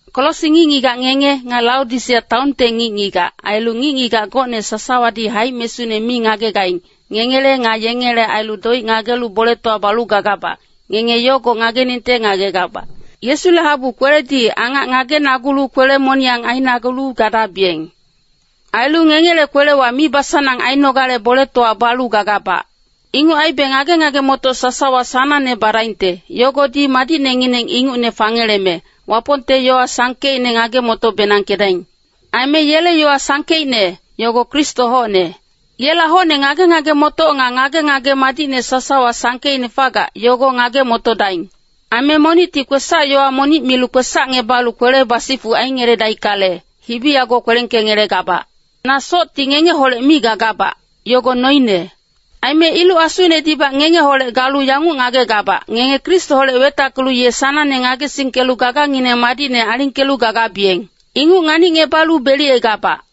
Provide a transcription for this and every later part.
Kolosi ngic-ngigac ngenge, nga Laodisea taonte ngic-ngigac, ailu ngic-ngigac gocne sasawadi haic-mesune mi ngagegaing, ngengele nga yengele ailu doic ngagelu boletowa balu gagabac, ngenge yogo ngageningte ngagegabac. Yesule habu kweledi angac ngagenagulu kwele-moniyang ainagulu gadabiyeng. Ailu ngengele kwelewa mibasanang ainogale boletowa balu gagabac. Inguc aibe ngage-ngage-motoc sasawa sanangne badaingte, yogodi madicnengineng ingucne fangeleme, Wapongte yowa sangkeicne ngage-moto-benangkedaing. Aime yele yowa sangkeicne, yogo Kristo hocne. Yela hocne ngage-ngage-motoc nga ngage-ngage madicne sasawa sangkeicne fagac, yogo ngage-motodaing. Aime monicti kwesac-yowa monic milu kwesacngebalu kwele basifuc aingeledaickale, hibi yago kwelengkengelegabac. Na socti ngengeholec mi gagabac, yogo noine. Aime iluc-asunedibac ngengeholec galu yanguc ngagegabac, ngenge Kristoholec wetackelu ye sanangne ngagesingkelu gagangineng madicne alingkelu gagabiyeng. Inguc nganicngebalu beliyegabac.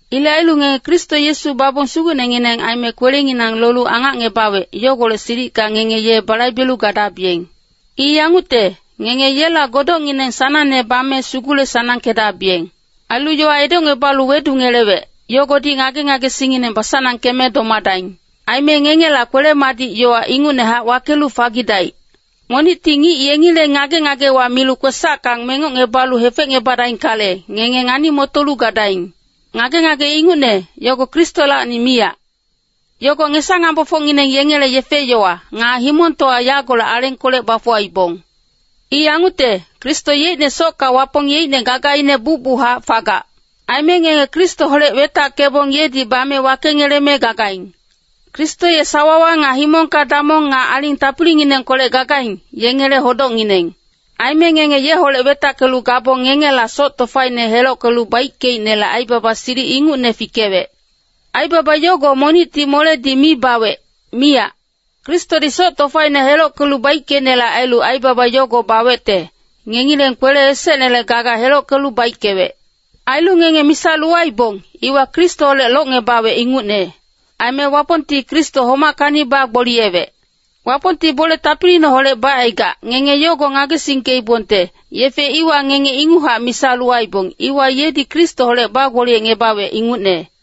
Ilec ailu ngenge Kristo Yesu babong Sugucnengineng aime kwelenginang lolu angacngebawec, yogolec silicka ngenge ye balaibelu gadabiyeng. I yangucte, ngenge yela godocngineng sanangne bame sugule-sanangkedabiyeng. Ailu yowa edocngebalu wedungelewec, yogodi ngage-ngagesingngineng basanangkeme domadaing. Aime ngengela kwele-madic yowa ingucnehac wakelu fagidaic. Monicti ngic yengileng ngage-ngagewa milu kwesacka mengocngebalu hefecngebadaickale, ngenge ngani-motolu gadaing. Ngage-ngage ingucne, yogo Kristolacni miyac. Yogo ngesa-ngambofocngineng yengele yefe-yowa, nga himongtowa yagolec alengkolec bafuwaibong. I yangucte, Kristo yeicne socka Wapong yeicne gagaine bucbuchac fagac. Aime ngenge Kristoholec wetackebong yedi bame wakengeleme gagaing. Kristo ye sawawa nga himongka damong nga aling tapilinginengkolec gagaing, yengele hodocngineng. Aime ngenge yeholec wetackelu gabong ngengela soc tofaine helockelu baickeicnele aibaba silic ingucne fikewec. Aibaba yogo monicti moledi mi bawec, miyac. Kristodi soc tofaine helockelu baickeicnele ailu aibaba yogo bawecte, ngengileng kwele esecnele gaga helockelu baickewec. Ailu ngenge misa lowaibong, iwa Kristoholec longngebawec ingucne. Aime Wapongti Kristo homackacni bagboliyewec. Wapongti bole tapiliineholec bacaigac, ngenge yogo ngagesingkeibongte, yefe iwa ngenge inguchac misa lowaibong, iwa yedi Kristoholec bagboliyecngebawec ingucne.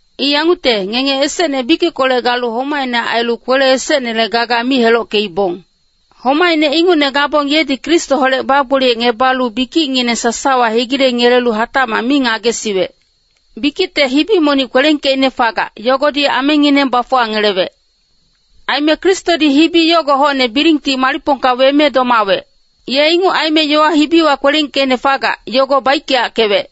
I yangucte, ngenge esecne bikickolec galu homaicne ailu kwele esecnele gaga mi helockeibong. Homaicne ingucne gabong yedi Kristoholec bagboliyecngebalu bikicngineng sasawa hegilengelelu hatacmac mi ngagesiwec. Bikicte hibi monic kwelengkeicne fagac, yogodi amengineng bafuwangelewec. Aime Kristodi hibi yogo hocne bilingti malicpongka weme domawec. Ye inguc aime yowa hibiwa kwelengkeicne fagac, yogo baickeyackewec.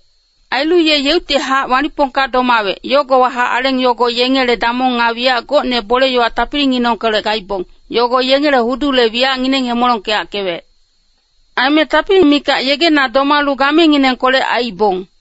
Ailu ye yeuctihac malicpongka domawec, yogowahac aleng yogo yengele damong nga wiyac gocne bole-yowa tapilinginengkolec gaibong, yogo yengele hudule wiyacngineng hemolongkeyackewec. Aime tapili mikac yegena domalu gamenginengkolec aiibong.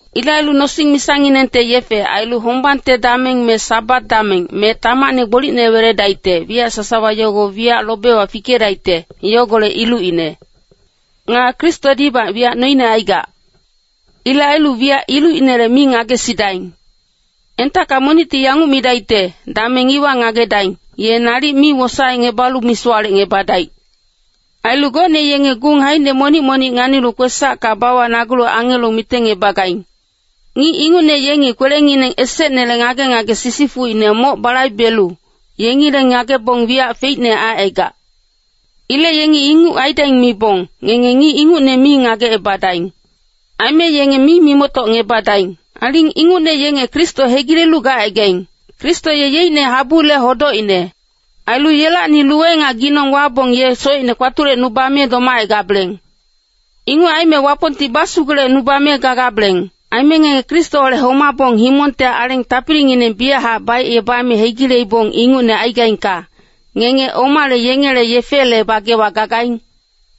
Ilec ailu nosing-misanginengte yefe, ailu hombang dameng me Sabat dameng, me tamacne gbolicne weledaicte, wiyac sasawa yogo wiyac lobewa fikedaicte, yogolec ilucine. Nga Kristodibac wiyac noine aigac. Ilec ailu wiyac ilucinele mi ngagesidaing. Entacka monicti yanguc midaicte, “Dameng iwa ngagedaing,” ye nalic mi wosaecngebalu misowalecngebadaic. Ailu gocne yengi gung haicine monic-monic nganilu kwesacka bawacnagulu angelo mitengebagaing. Ngic ingucne yenge kwelengineng esecnele ngage-ngage sisifucine moc balaibelu, yengileng ngagebong wiyac feicne aicaigac. Ilec yengi inguc aidaing mibong, ngenge ngic ingucne mi ngagecebadaing. Aime yenge mi mimoctocngebadaing. Aling ingucne yenge Kristo hegilelu gacaigaing. Kristo ye yeicne habule hodocine. Ailu yelacni luwe nga ginong wabong ye socine kpatulecnubame domacaigabeleng. Inguc aime Wapongti basugulecnubame gagabeleng. Aime ngenge Kristoholec homabong himongte aleng tapilingineng biyachac baicebame hegileibong ingucne aigaingka, ngenge omale yengele yefele bagewa gagaing?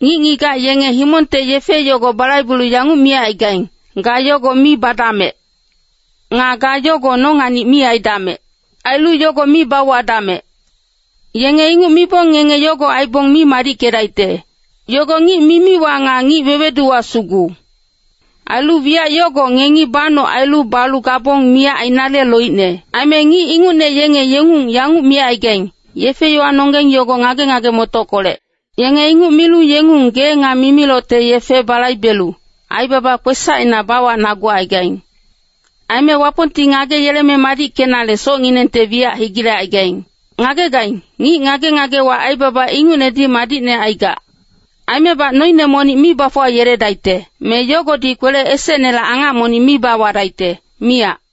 Ngic-ngigac yenge himongte yefe yogo balaibelu yanguc micaigaing, “Ga yogo mi badamec.” Nga “Ga yogo nonganic mi aidamec.” Ailu “yogo mi bauwadamec.” Yenge inguc mibong ngenge yogo aibong mi madickedaicte. Yogo ngic mimiwa nga ngic weweduwa sugu. Ailu wiyac yogo ngengi banoc ailu balu gabong miyac ainale loicne. Aime ngic ingucne yenge yengung yanguc micaigaing, “Yefe-yowanonggeng yogo ngage-ngage-motockolec.” Yenge inguc milu yengung gee nga mimilocte yefe balaibelu, aibaba kwesacina bawacnagucaigaing. Aime Wapongti ngageyeleme madickenale socnginengte wiyac hegilecaigaing. Ngagegaing, ngic ngage-ngagewa aibaba ingucnedi madicne aigac. Aimebac noine monic mi bafuwayeledaicte, me yogodi kwele esecnele angac monic mi bawadaicte, miyac.